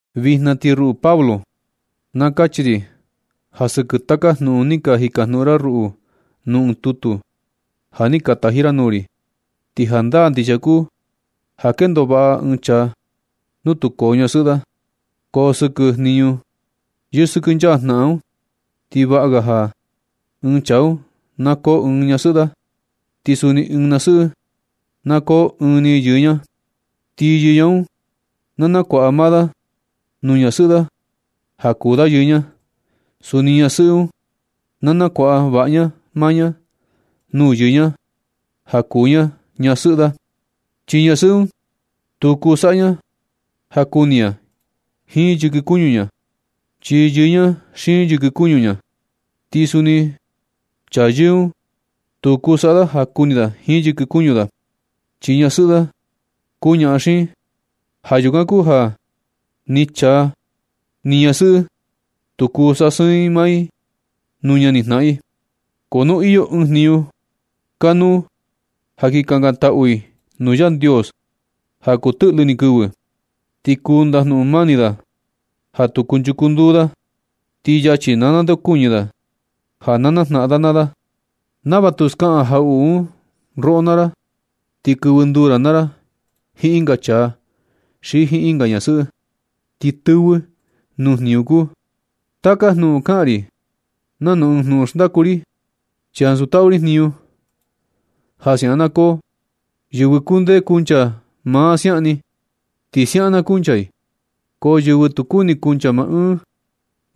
Vijna ti ruꞌu Pablo na kachi ri ja sɨkɨ taka jnuꞌun ni ka jikajnuꞌun ra ruꞌu nuu ɨɨn tutu ja ni ka taji ra nuu ri. Ti jandaa ndixia kuu ja kendo vaꞌa ɨɨn chaa nu tu koo ñasɨꞌɨ da. Ko sɨkɨ jniñu yɨsɨkɨnchaa jnaꞌan un, ti vaꞌa ga ja ɨɨn chaa un na koo ɨɨn ni ñasɨꞌɨ da, ti suni ɨɨn ñasɨꞌɨ na koo ɨɨn ni yɨɨ ña. Ti yɨɨ ña un na kuaꞌa da maa da nuu ñasɨꞌɨ da ja kuu da yɨɨ ña. Suni ñasɨꞌɨ un, na kuaꞌa vaꞌa ña maa ña nuu yɨɨ ña ja kuu ña ñasɨꞌɨ da. Chi ñasɨꞌɨ un tu kuu saꞌa ña ja kuni ña jiin yɨkɨ kuñu ña, chi yɨɨ ña xiin yɨkɨ kuñu ña. Ti suni chaa yɨɨ un tu kuu saꞌa da ja kuni da jiin yɨkɨ kuñu da, chi ñasɨꞌɨ da kuu ñaꞌan xiin. Ja yukan kuu ja ni chaa ni ñasɨꞌɨ tu kuu sasɨɨn i maa i nuu ñanijnaꞌan i. Ko nu iyo ɨɨn jniñu kanuu ja kin kakantaꞌu i nuu Yandios ja kuu tɨꞌlɨ ni kɨvɨ, ti kuu ndajnuꞌun mani da ja tu kunchuchu nduu da, ti yachi na ndeokuñɨ da ja na najnaꞌan da naa da, nava tu skaꞌan jaꞌuꞌu un roꞌo naa ra, ti kɨvɨ nduu ra naa ra jiin ɨnga chaa xi jiin ɨnga ñasɨꞌɨ, ti tɨvɨ nuu jniñu kuu. Taka jnuꞌun un kaꞌan ri nanu ɨɨn junꞌun xndaku ri, chi ansu taꞌu ri jniñu ja siaꞌan na koo. Yɨvɨ kundee kuncha maa siaꞌan ni, ti siaꞌan na kuncha i, ko yɨvɨ tu kuni kuncha maa ɨɨn,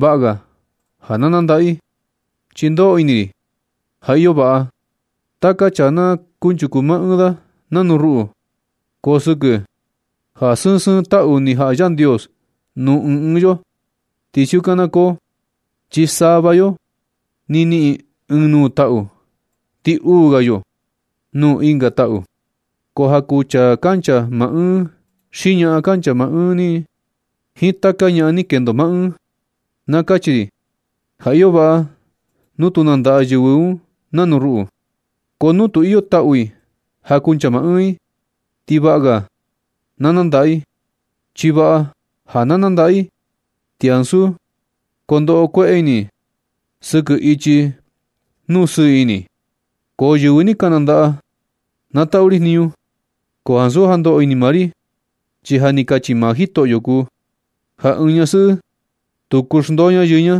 vaꞌa ga na nandaꞌa i. Chi ndoꞌo ini ri ja iyo vaꞌa ja taka chaa na kunchuku maa ɨɨn da nanu ruꞌu, ko sɨkɨ ja sɨɨn sɨɨn taꞌu ni jaꞌa Yandios nuu ɨɨn ɨɨn yo, ti siukan na koo, chi sava yo ni niꞌin ɨɨn nuu taꞌu, ti uu ga yo nuu ɨnga taꞌu. Ko ja kuu chaa kancha maa ɨɨn xi ñaꞌan kancha maa ɨɨn jiin taka ñaꞌan ni kendo maa ɨɨn, na kachi ri ja iyo vaꞌa nu tu nandaꞌa yɨvɨ un nanu ruꞌu. Ko nu tu iyo taꞌu i ja kuncha maa ɨɨn i, ti vaꞌa ga na nandaꞌa, chi vaꞌa ja na nandaꞌa i, ti ansu kondoꞌo kueꞌe ini i sɨkɨ ichi nuu sɨɨ ini. Ko yɨvɨ ni ka nandaꞌa, na taꞌu ri jniñu, ko ansu ja ndoꞌo ini maa ri, chi ja ni kachi maa Jitoꞌyo kuu ja ɨɨn ñasɨꞌɨ tu kuu xndoo ña yɨɨ ña.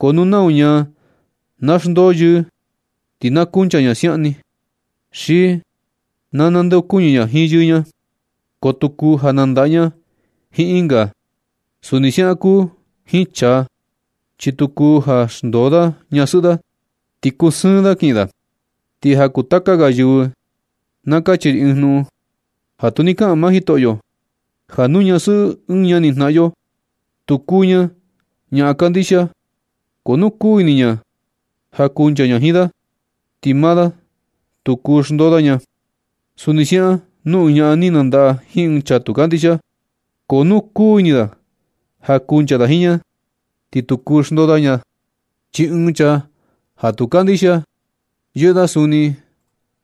Ko nu nau ñaa na xndoo yɨɨ, ti na kuncha ña siaꞌan ni, xi na ndeokuñɨ ña jiin yɨɨ ña, ko tu kuu ja nandaꞌa ña jiin ɨnga. Suni siaꞌan kuu jiin chaa, chi tu kuu ja xndoo da ñasɨꞌɨ da, ti kusɨɨn da kiꞌin da. Ti ja kuu taka ga yɨvɨ na kachi ri ɨɨn jnuꞌun ja tu ni kaꞌan maa Jitoꞌyo, ja nu ñasɨꞌɨ ɨɨn ñanijnaꞌan yo tu kuu ña ñaa kandixia, ko nu kuu ini ña ja kuncha ña jiin da, ti maa da tu kuu xndoo da ña. Suni siaꞌan nu ɨɨn ñaꞌan ni nandaꞌa jiin ɨɨn chaa tu kandixia, ko nu kuu ini da ja kuncha da jiin ña, ti tu kuu xndoo ña da. Chi ɨɨn chaa ja tu kandixia yɨꞌɨ da suni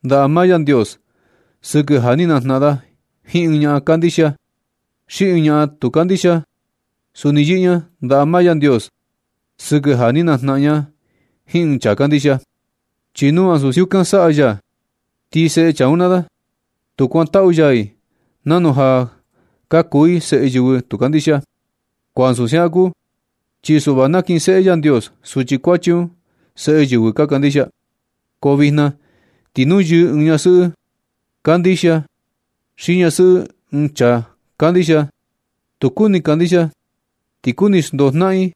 ndaꞌa maa Yandios sɨkɨ ja ni najnaꞌan da jiin ɨɨn ñaꞌan kandixia. Xi ɨɨn ñaꞌan tu kandixia suni yɨꞌɨ ña ndaꞌa maa Yandios sɨkɨ ja ni najnaꞌan ña jiin ɨɨn chaa kandixia. Chi nu ansu siukan saꞌa ya, ti seꞌe chaa un naa da, tu kuantaꞌu ya i nanu ja ka kuu i seꞌe yɨvɨ tu kandixia. Ko ansu siaꞌan kuu, chi suꞌva nakinseꞌe Yandios suchi kuachi un seꞌe yɨvɨ ka kandixia. Ko vijna ti nu yɨɨ ɨɨn ñasɨꞌɨ kandixia xi ñasɨꞌɨ ɨɨn chaa kandixia tu kuni kandixia, ti kuni xndoo jnaꞌan i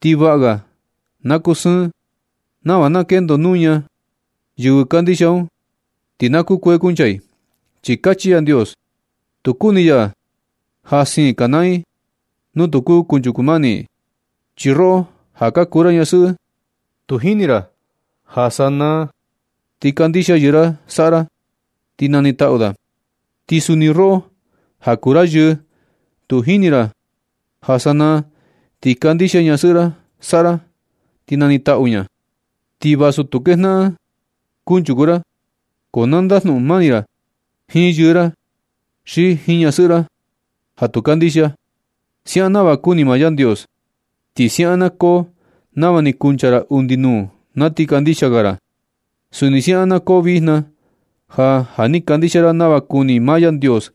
ti vaꞌa ga na kusɨɨn, nava na kendo nuña yɨvɨ kandixia un, ti na kukuee kuncha i, chi Yandios tu kuni ya ja siin kanaa i nu tu kuu kunchuku mani i. Chi roꞌo ja kuu ra ñasɨꞌɨ, tu jini ra ja sanaa ti kandixia yɨɨ ra saꞌa ra ti na nitaꞌu da. ¿Ti sa ni tu roꞌo ja kuu ra yɨɨ tu jini ra ja sanaa ti kandixia ñasɨꞌɨ ra saꞌa ra ti na nitaꞌu ña nu? Ti vasu tu kejnaꞌan kunchuku ra, ko na ndajnuꞌun mani ra jiin yɨɨ ra xi jiin ñasɨꞌɨ ra ja tu kandixia, siaꞌan nava kuni maa Yandios. Ti siaꞌan na koo nava ni kuncha ra undi nuu na ti kandixia ga ra. Suni siaꞌan na koo vijna, ja ja ni kandixia ra nava kuni maa Yandios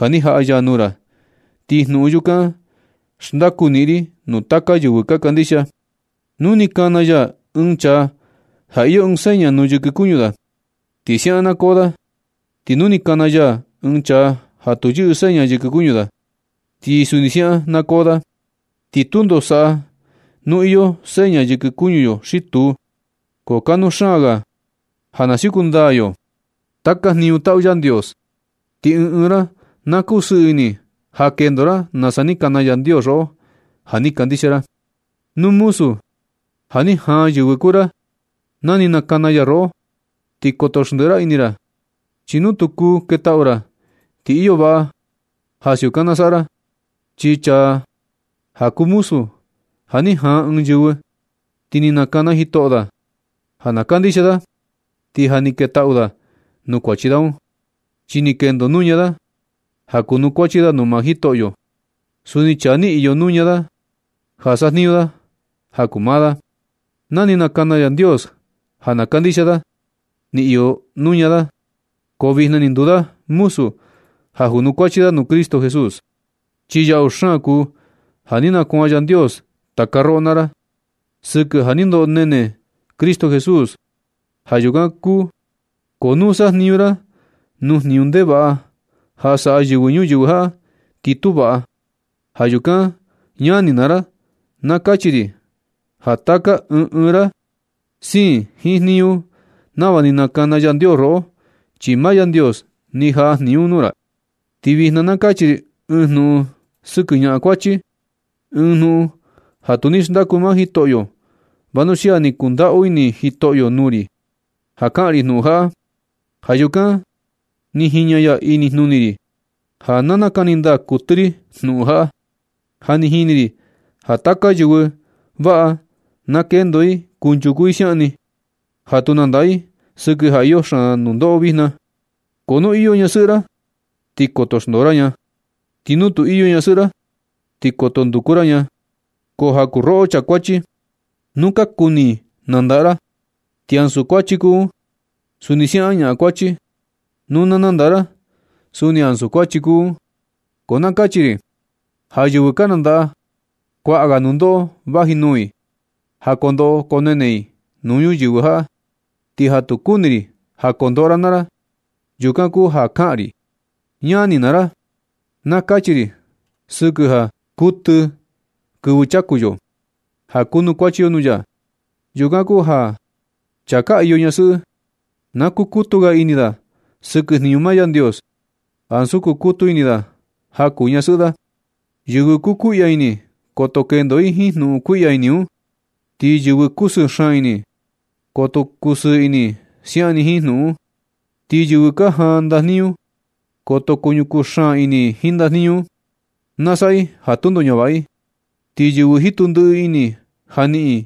ja ni jaꞌa ya nuu ra. Ti jnuꞌun yukan xndaku niꞌin ri nuu taka yɨvɨ ka kandixia. Nu ni kana ya ɨɨn chaa ja iyo ɨɨn seña nuu yɨkɨ kuñu da, ti siaꞌan na koo da. Ti nu ni kana ya ɨɨn chaa ja tu yɨꞌɨ seña yɨkɨ kuñu da, ti suni siukan na koo da. Ti tundo saꞌa nu iyo seña yɨkɨ kuñu yo xi tu, ko kanuu xaan ga ja na siuku ndaa yo taka jniñu taꞌu Yandios. Ti ɨɨn ɨɨn ra na kusɨɨ ini ja kendo ra nasa ni kana Yandios roꞌo ja ni kandixia ra. Nu muzu ja ni jaan yɨvɨ kuu ra na ni nakana ya roꞌo, ti koto xndiꞌi ra ini ra, chi nu kuu ketaꞌu ra, ti iyo vaꞌa ja siukan na saꞌa ra. Chi chaa ja kuu muzu ja ni jaan ɨɨn yɨvɨ, ti ni nakana Jitoꞌyo da ja na kandixia da, ti ja ni ketaꞌu da nuu kuachi da un, chi ni kendo nuña da ja kunukuachi da nuu maa Jitoꞌyo. Suni chaa ni iyo nuña da ja sajniñu da ja kuu maa da, na ni nakana Yandios ja na kandixia da, ni iyo nuñu da, da ko vijna ni nduu da muzu ja kunukuachi da nuu Cristo Jesús. Chi yaꞌu xaan kuu ja ni nakuan Yandios taka roꞌo naa ra sɨkɨ ja ni ndoꞌo ni nene Cristo Jesús. Ja yukan ko nu sajniñu ra nuu jniñu ndevaꞌa ja saꞌa yɨvɨ ñuyɨvɨ jaꞌa, ti tu vaꞌa. Ja yukan ñani naa ra, na kachi ri ja taka ɨɨn ɨɨn ra, siin jiin jniñu nava ni nakana Yandios roꞌo, chi maa Yandios ni jaꞌa jniñu un nuu ra. Ti vijna na kachi ri ɨɨn jnuꞌun sɨkɨ ñaꞌan kuachi, ɨɨn jnuꞌun ja tu ni xndaku maa Jitoꞌyo, vanuxia ni kundaꞌu ini Jitoꞌyo nuu ri ja kaꞌan ri jnuꞌun jaꞌa. Ja yukan ni jiña ya inijnuni ri ja na nakani ndaa kuɨtɨ ri jnuꞌun jaꞌa. Ja ni ini ri ja taka yɨvɨ, vaꞌa na kendo i kunchuku i siaꞌan ni, ja tu nandaꞌa i sɨkɨ ja iyo xaan nundoꞌo vijna. Ko nu iyo ñasɨꞌɨ ra, ti koto xndoo ra ña. Ti nu tu iyo ñasɨꞌɨ ra, ti koto nduku ra ña. Ko ja kuu roꞌo chaa kuachi, nu ka kuni nandaꞌa ra, ti ansu kuachi kuu un. Suni siaꞌan ñaꞌan kuachi, nu na nandaꞌa ra, suni ansu kuachi kuu un. Ko na kachi ri ja yɨvɨ ka nandaꞌa, kuaꞌa ga nundoꞌo vaji nuu i ja koo ndoꞌo koo nene i nuu ñuyɨvɨ jaꞌa. Ti ja tu kuni ri ja kondoꞌo ra naa ra, yukan kuu ja kaꞌan ri. Ñani naa ra, na kachi ri sɨkɨ ja kuɨtɨ kɨvɨ chaku yo ja kunukuachi yo nuu ya. Yukan kuu ja chaa ka iyo ñasɨꞌɨ, na kukutu ga ini da sɨkɨ jniñu maa Yandios ansu kukutu ini da ja kuu ñasɨꞌɨ da. Yɨvɨ kukuiꞌya ini, koto kendo i jiin jnuꞌun kuiꞌya ini un. Ti yɨvɨ kusɨɨ xaan ini, koto kusɨɨ ini i siaꞌan ni jiin jnuꞌun un. Ti yɨvɨ ka jaan ndajniñu, koto kuñukuu xaan ini i ndajniñu un, na saꞌa i ja tundo ñavaꞌa i. Ti yɨvɨ jitu ndiꞌi ini ja niꞌin yɨ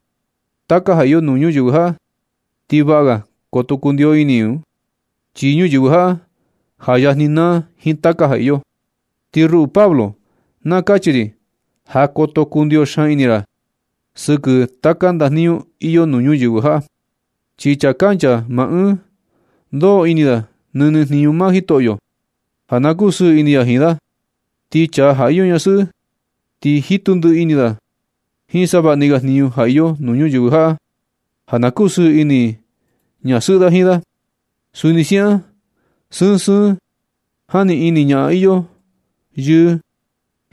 taka ja iyo nuu ñuyɨvɨ jaꞌa, ti vaꞌa ga koto kundio ini i un, chi ñuyɨvɨ jaꞌa, ja yajni naa jiin taka ja iyo. Ti ruꞌu Pablo, na kachi ri ja koto kundio xaan ini ra sɨkɨ taka ndajniñu iyo nuu ñuyɨvɨ jaꞌa, chi chaa kancha maa ɨɨn, ndoꞌo ini da nɨnɨ jniñu maa Jitoꞌyo, ja na kusɨɨ ini ya jiin da. Ti chaa ja iyo ñasɨꞌɨ, ti jitu ndiꞌi ini da jiin savaꞌni ga jniñu ja iyo nuu ñuyɨvɨ jaꞌa ja na kusɨɨ ini ñasɨꞌɨ da jiin da. Suni siaꞌan sɨɨn sɨɨn jani ini ñaꞌan iyo yɨɨ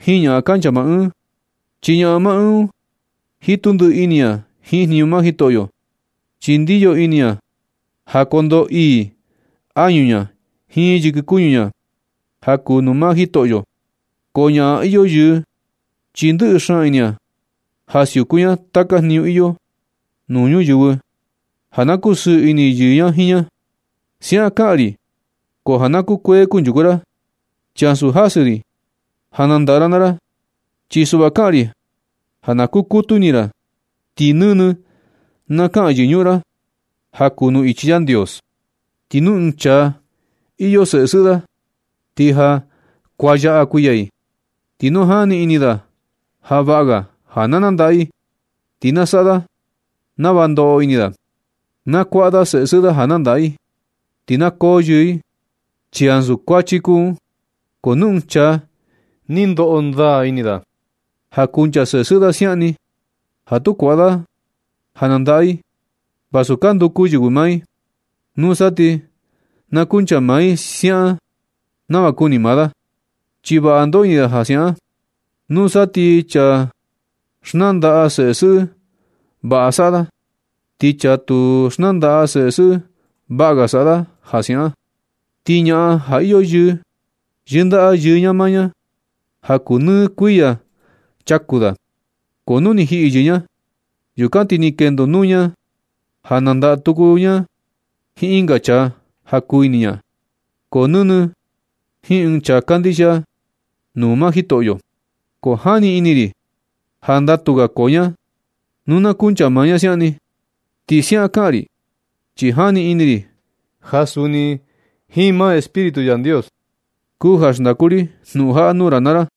jiin ñaꞌan kancha maa ɨɨn, chi ñaꞌan maa ɨɨn un jitu ndiꞌi ini ña jiin jniñu maa Jitoꞌyo, chi ndiyo ini ña ja kondoo ii añu ña jiin yɨkɨ kuñu ña ja kuu nuu maa Jitoꞌyo. Ko ñaꞌan iyo yɨɨ, chi ndɨꞌɨ xaan ini ña ja siuku ña taka jniñu iyo nuu ñuyɨvɨ ja na kusɨɨ ini yɨɨ ña jiin ña. Siaꞌan kaꞌan ri ko ja na kukuee kunchuku ra, chi ansu jasɨ ri ja nandaꞌa ra naa ra. Chi suꞌva kaꞌan ri ja na kukutu ini ra, ti nɨnɨ na kaka yɨñuꞌun ra ja kuu nuu ichi Yandios. Ti nu ɨɨn chaa iyo seꞌe sɨꞌɨ da, ti ja kuanyaꞌa kuiya i, ti nu jani ini da ja vaꞌa ga ja na nandaꞌa i, ti na saꞌa da nava ndoꞌo ini da. Na kuaꞌa da seꞌe sɨꞌɨ da ja nandaꞌa i, ti na koo yɨɨ i, chi ansu kuachi kuu un. Ko nu ɨɨn chaa ni ndoꞌo ndaa ini da ja kuncha seꞌe sɨꞌɨ da siaꞌan ni, ja tu kuaꞌa da i nandaꞌa i vasu ka nduku yɨvɨ maa i, nusa ti na kuncha maa i siaꞌan ni nava kuni maa da, chi vaꞌa ndoꞌo ini da ja siaꞌan. Nusa ti chaa xnandaꞌa seꞌe sɨꞌɨ, vaꞌa saꞌa da. Ti chaa tu xnandaꞌa seꞌe sɨꞌɨ, vaꞌa ga saꞌa da ja siaꞌan. Ti ñaꞌan ja iyo yɨɨ, yɨndaꞌa yɨɨ ña maa ña ja kuu nɨ kuɨyi chaku da. Ko nu ni jiꞌi yɨɨ ña, yukan ti ni kendo nuñu ña ja nandaꞌa tuku ña jiin ɨnga chaa ja kuu ini ña, ko nɨnɨ jiin ɨɨn chaa kandixia nuu maa Jitoꞌyo. Ko jani ini ri ja ndatu ga koo ña nu na kuncha maa ña siaꞌan ni. Ti siaꞌan kaꞌan ri, chi jani ini ri ja suni jiin maa Espíritu Yandios kuu ja xndaku ri jnuꞌun jaꞌa nuu ra naa ra.